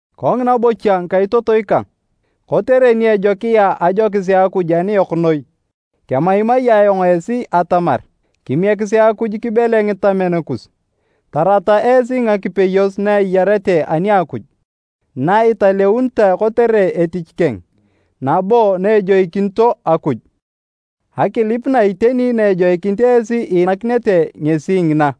Kongina bocha ngikaitotoi kang, kotere ni ejokia ajokis a Akuj aniyok noi, kemaimai ayong esi atamar, kimiekisi Akuj kibele ngitamen kus, tarata esi ngakipeyos na eyarete ani a Akuj, na italeunitoe kotere etich keng, nabo na ejoikinito Akuj. Akilip na iteni na ejoikinit esi iinakinete ngesi ngina.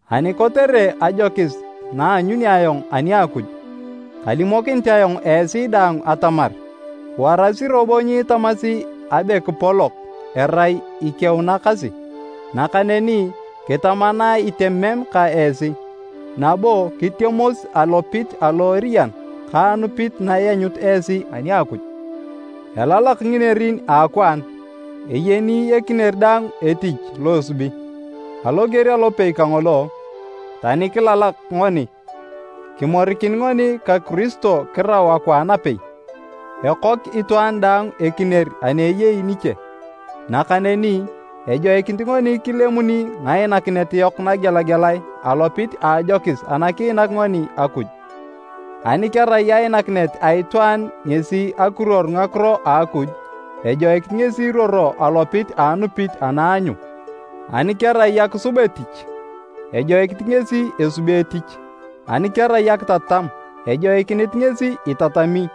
Ani kotere ajokis na aanyuni ayong ani a Akuj, kalimokinit ayong esi daang atamar, warasi robo nyiitamasi abe kipolok erai ikeunakasi. Nakaneni kitama na itemem ka esi, nabo kitemos alopit alo eriyan ka anupit na ianyut esi ani a Akuj. Elalak nginerin a akwaan, eyeni ekinier daang etich lo esubi. Aloger alopei kangolo, tani kilalak ngoni, kimorikin ngoni ka Kiristo kirau akwaan apei, ekok itwaan daang ekinier ani eyei niche. Nakaneni, ejoikinit ngoni kilemuni ngainakinet yok nagelagelae alopit a ajokis ana kiinak ngoni Akuj. Ani kerai ainakinet a itwaan ngesi akiruor Ngakiro a Akuj, ejoikinit ngesi iruoro alopit a anupit ana aanyu, ani kerai akisub etich, ejoikinit ngesi esubi etich, ani kerai akitatam, ejoikinit ngesi itatami,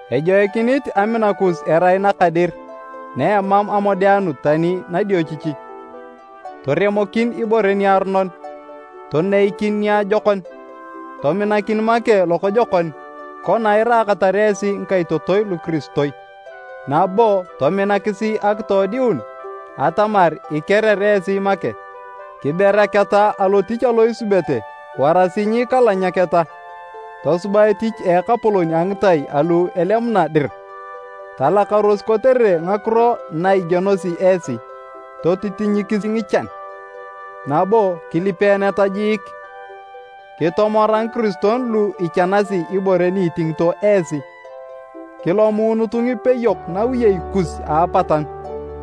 Ejoikinit amina kus erai naka dir na emam amodeanut tani nadiochichi. Toremokin ibore niaronon, toneikin niajokon. Tominakin make lokojokon kona iraakatar esi ngikaitotoi lukiristoi, nabo tominakisi akitoodiun atamar ikerer esi make. Kiberaketa alotich alo isubete warasi nyiikalanyaketa. Tosuba etich a Ekapolon a ngitai alu elemuna dir. Talakaros kotere ngakiro na igienosi esi, totitinyikisi ngichan, nabo kilipeeneta jiik. Kitomora ngikiristoi lu ichanasi ibore ni itingito esi, kilomuunutu ngipeyok nawiyei kus a apatanu.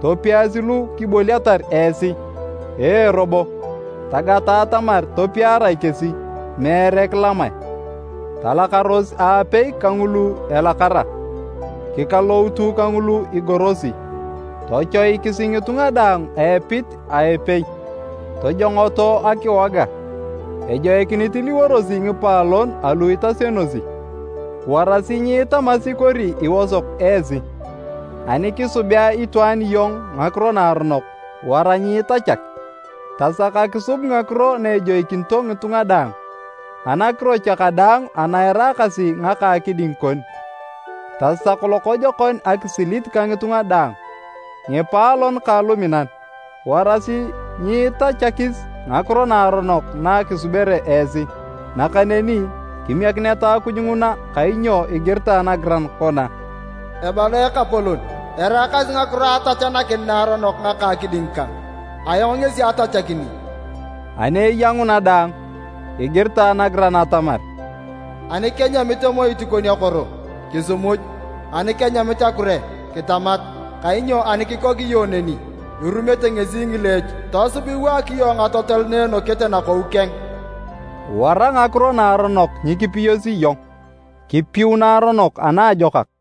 Topiasi lu kiboliatar esi. Ee robo, tagata atamar topiarae kesi, meere kilamae. Talakaros aapei kangulu elakara, kikaloutu kangulu igorosi. Tochoikisi ngitunga daang a epit a epei. Tojongoto akiwoga, ejoikinit iliworosi ngipaalon alu itasionosi. Warasi nyiitamasi kori iosok esi. Ani kisubea itwaan iyong ngakiro naaronok, wara nyiitachak. Tasak akisub ngakiro na ejoikinito ngitunga daang. Anakiro cha kadaang ana eraakasi ngaka akiding kon, tasak lokojokon akisilit ka ngitunga daang. Ngipaalon kang luminan, warasi nyiitachakis ngakiro naaronok na kisubere esi, nakaneni, kimiekineta Akuj nguna kainyo igiritae nagiran kona, “Ebala Ekapolon, eraakasi ngakiro a atachanakin naaronok ngaka a akiding kang, ayong ngesi atachakini.” Ani eya nguna daang, igiritae nagiran atamar, “Ani kenyamit emoit kon akoro, kisimuj, ani kenyamit akure, kitamat, kainyo ani kikok iyong neni, irumete ngesi ngileech, tosub iwaak ngatotol na enokete nakou keng.” Wara ngakiro naaronok nyikipiyosi iyong, kipiu naaronok anaajokak.